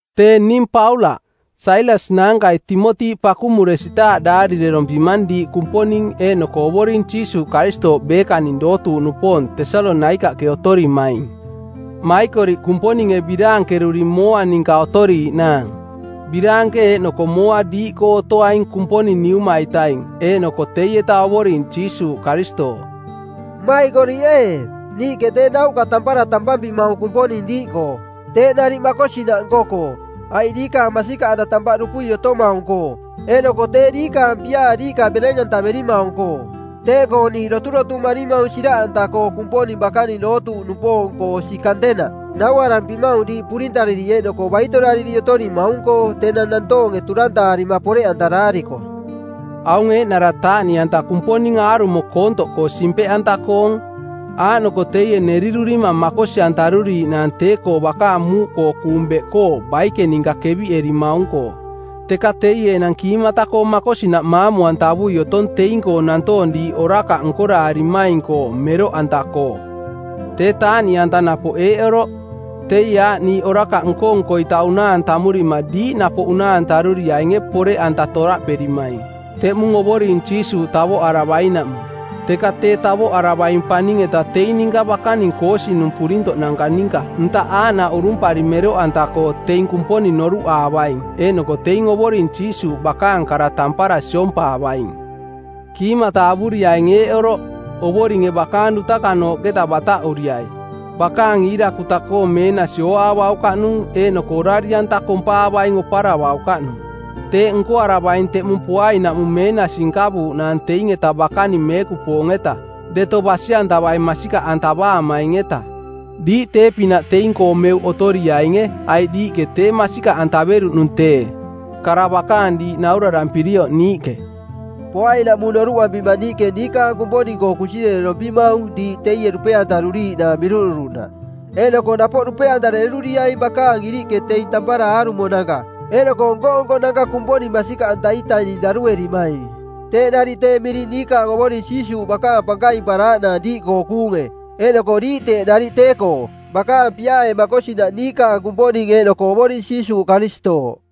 Tee ning Paulaꞌ. Sailas naankai Timoti pakumuresitaaꞌ daarirerompimang diiꞌ Kumponing eeꞌnoko Ovoring Jiisuuꞌ Karistooꞌ beekaning dootuuꞌnupoong Tesalonaikaꞌke otorimaing. Maikoriꞌ Kumponinge biraankeruri mooa ninka otoriiꞌnaang. Biraanke eeꞌnoko mooa diiꞌkoo otoaing Kumponing Niuma-itaing eeꞌnoko teieta Ovoring Jiisuuꞌ Karistooꞌ. Mmaikoriꞌ ee, niiꞌke tee nauꞌka tampara tampampimaung Kumponing diiꞌkoo. Teeꞌ nariꞌ makosinaꞌ nko-koo, aiꞌ diikaang masikaꞌanta tampaꞌ dupui otomaung-koo, eeꞌnoko tee diikaang piaa diiꞌka bereng-antaverimaung-koo. Teeꞌkoo niiꞌ doturotumarimaung siraꞌanta-koo Kumponing bakaning dootuuꞌnupoong-koo osi kantenaꞌ. Nauarampimaung diiꞌ purintariri eeꞌnoko baitorariri otorimaung-koo tenang nantoonge turantaarima poreꞌantaraariko. Aung eeꞌnara taaꞌniꞌanta Kumponing aarumo koontoꞌkoo simpeꞌanta-koong, aaꞌnoko teie nerirurimang makosi-antaruriiꞌnaang tee-koo bakaang muuꞌkoo kuung beꞌkoo baike ninka kaviꞌerimaung-koo. Teka teie enang kiimata makosinaꞌ maamu-antavui otong teing-koo nantoong diiꞌ orakaꞌ nkoraarimaing-koo, meroꞌanta-koo. Tee taaꞌniꞌanta napoꞌ eeꞌ oroꞌ: Teie aaꞌ niiꞌ orakaꞌ nko-nko-ita unaa-anta amurima diiꞌ napoꞌ unaa-antaruriainge poreꞌanta toraꞌperimaing, teꞌmung Ovoring Jiisuuꞌ tavoꞌaravainaꞌmung; Teka tee tavoꞌaravaing paning-eta teing ninka bakaning koosinung˜ purintoꞌnanka ninka ntaꞌ aaꞌnaꞌ urumpari mero-anta-koo teing Kumponing noruꞌaavaing eeꞌnoko teing Ovoring Jiisuuꞌ bakaang kara tampara siompaavaing. Kiimata avuriaing eeꞌ oroꞌ: Ovoringe bakaang dutakanooꞌketa bataꞌuriai, bakaang iirakuta-koong meenasi ooaavaukaꞌnung eeꞌnoko orari-anta kompaavaing oparavaukaꞌnung. Teeꞌ nkoaravaing teꞌmung poainaꞌmung meenasi nkavuuꞌnaang teing-etaꞌ bakaning meekupoong-eta, deto basi-antavai masikaꞌantavaamaing-eta. Diiꞌ tee-pinaꞌ teing-koo meuꞌ otoriainge aiꞌ diiꞌke tee masikaꞌantaveruꞌnung tee, kara bakaang diiꞌ naurarampirioꞌ niiꞌke. Poainaꞌmung noruꞌampima niiꞌke niikaang Kumponing-koo kunsirerorompimaung diiꞌ teie dupe-antaruriiꞌnaang miruꞌduruꞌnaꞌ eeꞌnoko napoꞌ dupe-antareruriaing bakaang iriꞌke teing tampara aarumonanka eeꞌnoko nko-nkonanka Kumponing masikaꞌanta-itaning daruerimaing. Teeꞌ nariꞌ tee miring niikaang Ovoring Jiisuuꞌ bakaang pankaimparaaꞌnaang diiꞌkoo kuunge, eeꞌnoko diiꞌ teeꞌ nariꞌ tee-koo, bakaang piaae makosinaꞌ niikaang Kumponing eeꞌnoko Ovoring Jiisuuꞌ Karistooꞌ.